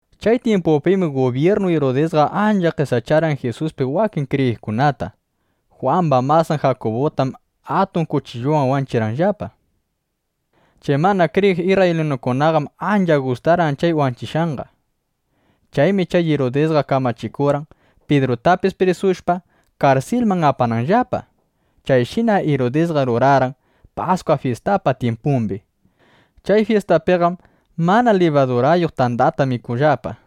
Chay tyimpupim gubyirnu Irudisqa ancha qesacharqan Jisuspi wakin kriyiqkunata. Jwamba masan Jakubutam atun kuchilluwan wanchichirqan. Chay mana kriyiq isrraylinukunaqam ancha gustarqan chay wanchishqanqa. Chaymi chay Irudisqa kamachikurqan Pidrutapis prisushpa, karsilman apananllapa. Chayshinam Irudisqa rurarqan Paskwa fyistapa tyimpumbi. Chay fyistapiqam mana libadurayuq tandata mikuqllapa.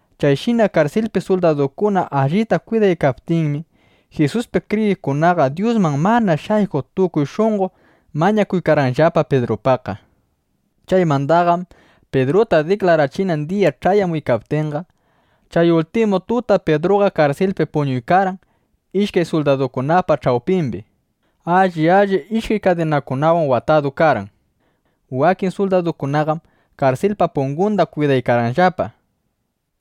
Chayshina karsilpi suldadukuna allita kwidaykaptinmi, Jisuspi kriyiqkunaqa Dyusman mana shaykuq tukuy shunqo mañakuykarqanllapa Pidrupaqqa. Chaymandaqam Pidruta diklarachinan diya ch'ayamuykaptinqa, chay ultimu tuta Pidruqa karsilpi puñuykarqan ishkay suldadukunapa ch'awpimbi. Alli alli ishkay kadinawan chay suldadukunapi watadu karqan. Wakin suldadukunaqam karsilpa pungunda kwidaykarqanllapa.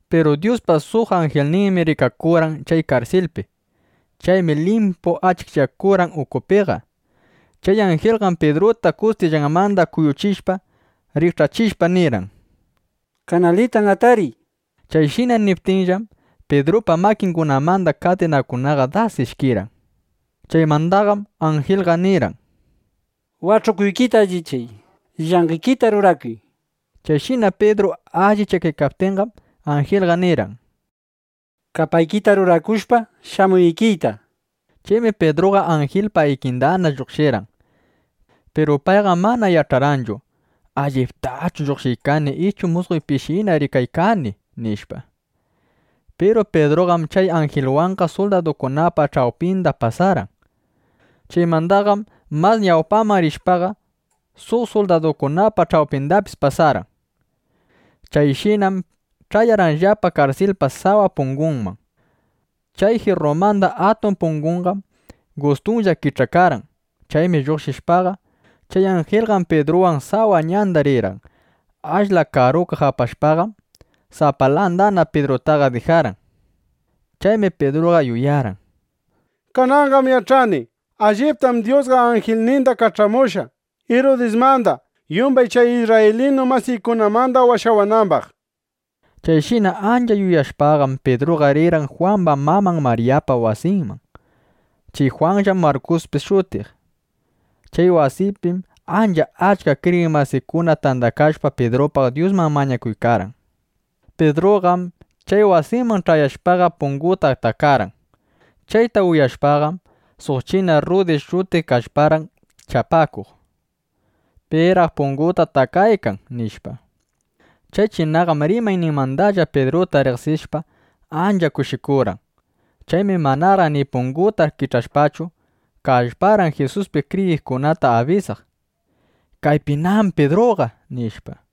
Piru Dyuspa suq anjilninmi rikakurqan chay karsilpi. Chaymi limpu achikchakurqan ukupiqa. Chay anjilqam Pidruta kustillanmanda kuyuchishpa, rikch'achishpa, nirqan: —Kanalitan atariy, nishpa. Chayshina niptinllam, Pidrupa makingunamanda kadinakunaqa das ishkirqan. Chaymandaqam anjilqa nirqan: —Wach'ukuykita allichay; llanqekita rurakuy, nishpa Chayshina Pidru allichakaptinqam, anjilqa nirqan: —Kapaykita rurakushpa, shamuy ikiyta, nishpa. Chaymi Pidruqa anjilpa ikindana lluqshirqan. Piru payqam mana yach'arqanchu: ¿Alliptachu lluqshiykani ichu musqoypishina rikaykani? nishpa. Piru Pidruqam chay anjilwanqa suldadukunapa ch'awpinda pasarqan. Chaymandaqam mas ñawpaman rishpaqa, suq suldadukunapa ch'awpindapis pasarqan. Chayshinam ch'ayarqanllapa karsilpa sawa pungunman. Chay jirrumanda atun punguqam gustunlla kich'akarqan. Chaymi lluqshishpaqa, chay anjilqa Pidruwan sawa ñandana rirqan. Ashla karukaq apashpaqam, sapalandana Pidrutaqa dijarqan. Chaymi Pidruqa yuyarqan: —Kananqam yach'ani: Alliptam Dyusqa anjilninda kach'amushqa, Irudismanda, yumbay chay isrraylinu masiykunamanda washawanambaq, nishpa. Chayshina ancha yuyashpaqam, Pidruqa rirqan Jwamba maman Maryapa wasinman. Chay Jwanllam Markuspis shutiq. Chay wasipim ancha achka kriyiq masikuna tandakashpa, Pidrupaq Dyusman mañakuykarqan. Pidruqam chay wasiman ch'ayashpaqa, punguta takarqan. Chayta uyashpaqam, suq china Rrudi shutiq kallparqan chapakuq: ¿Piraq punguta takaykan? nishpa. Chay chinaqam rimayninmandalla Pidruta riqsishpa, ancha kushikurqan. Chaymi manaraq ni punguta kich'ashpachu, kallparqan Jisuspi kriyiqkunata abisaq: —¡Kaypinam Pidruqa! nishpa.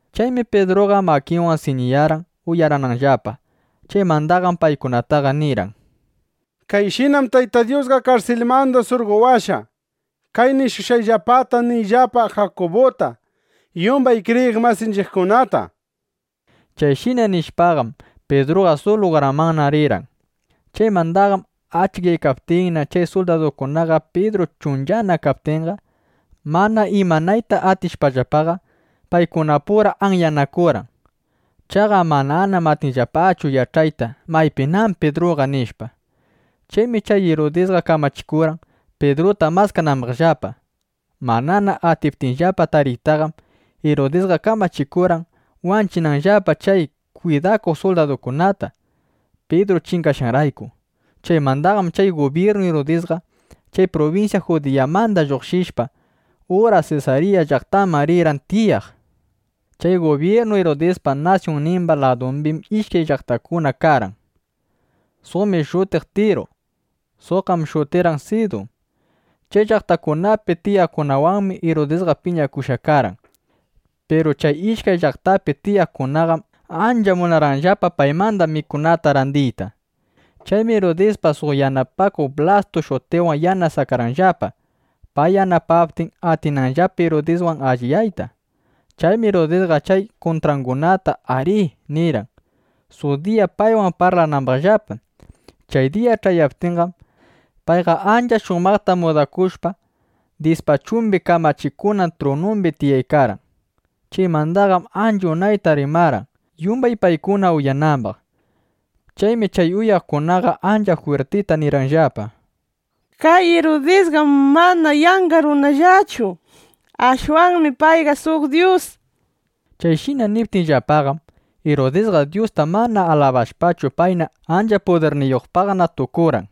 Chaymi Pidruqa makinwan siñiyarqan uyarananllapa. Chaymandaqam paykunataqa nirqan: —Kayshinam Tayta Dyusqa karsilmanda surqowashqa. Kay nishushqayllapata niyllapa Jakubuta, yumbay kriyiq masinchiqkunata, nishpa. Chayshina nishpaqam, Pidruqa suq lugarmanna rirqan. Chaymandaqam achikyaykaptinna, chay suldadukunaqa Pidru chunchana kaptinqa, mana imanayta atishpallapaqa, paykunapura anyanakurqan. Chaqa manam atirqanllapachu yach'ayta: Maypinam Pidruqa, nishpa. Chaymi chay Irudisqa kamachikurqan, Pidruta maskanambaqllapa. Manana atiptinllapa tariytaqam, Irudisqa kamachikurqan, wanchinanllapa chay kwidakuq suldadukunata, Pidru chingashqanrayku. Chaymandaqam chay gubyirnu Irudisqa chay prubinsya Judiyamanda lluqshishpa, ura Sesarya llaqtaman rirqan tiyaq. Chay gubyirnu Irudispa nasyunnimba ladumbim ishkay llaqtakuna karqan. Suqmi shutirqan Tiru. Suqqam shutirqan Sidun. Chay llaqtakunapi tiyaqkunawanmi Irudisqa piñakushqa karqan. Piru chay ishkay llaqtapi tiyaqkunaqam ancha munarqanllapa paymanda mikunata randiyta. Chaymi Irudispa suq yanapakuqnin Blastu shutiqwan yanasakarqanllapa, pay yanapaptin, atinanllapa Irudiswan alliyayta. Chaymi Irudisqa chay kuntrangunata “ari” nirqan, suq diya paywan parlanambaqllapa. Chay diya ch'ayaptinqam, payqa ancha shumaqta mudakushpa, dispachumbi kamachikunan trunumbi tiyaykarqan. Chaymandaqam ancha unayta rimarqan, yumbay paykuna uyanambaq. Chaymi chay uyaqkunaqa ancha jwirtita nirqanllapa: —¡Kay Irudisqam mana yanqa runallachu! ¡Ashwanmi payqa suq dyus! nishpa. Chayshina niptinllapaqam, Irudisqa Dyusta mana alabashpachu, payna ancha pudirniyuqpaq tukurqan.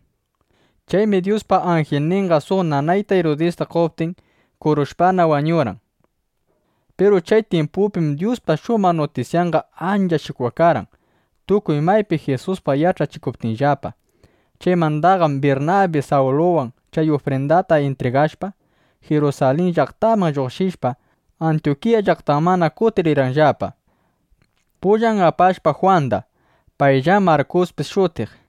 Chaymi Dyuspa anjilninqa suq nanayta Irudista qoptin, kurushpana, wañurqan. Piru chay tyimpupim Dyuspa shumaq nutisyanqa ancha shikwakarqan, tukuy maypi Jisuspaq yach'achikuptinllapa. Chaymandaqam Birnabi Sawluwan chay ufrindata intrigashpa, Jirusalin llaqtamanda lluqshishpa, Antyukiya llaqtamanna kutirirqanllapa, pullan apashpa Jwanda. Payllam Markuspis shutiq.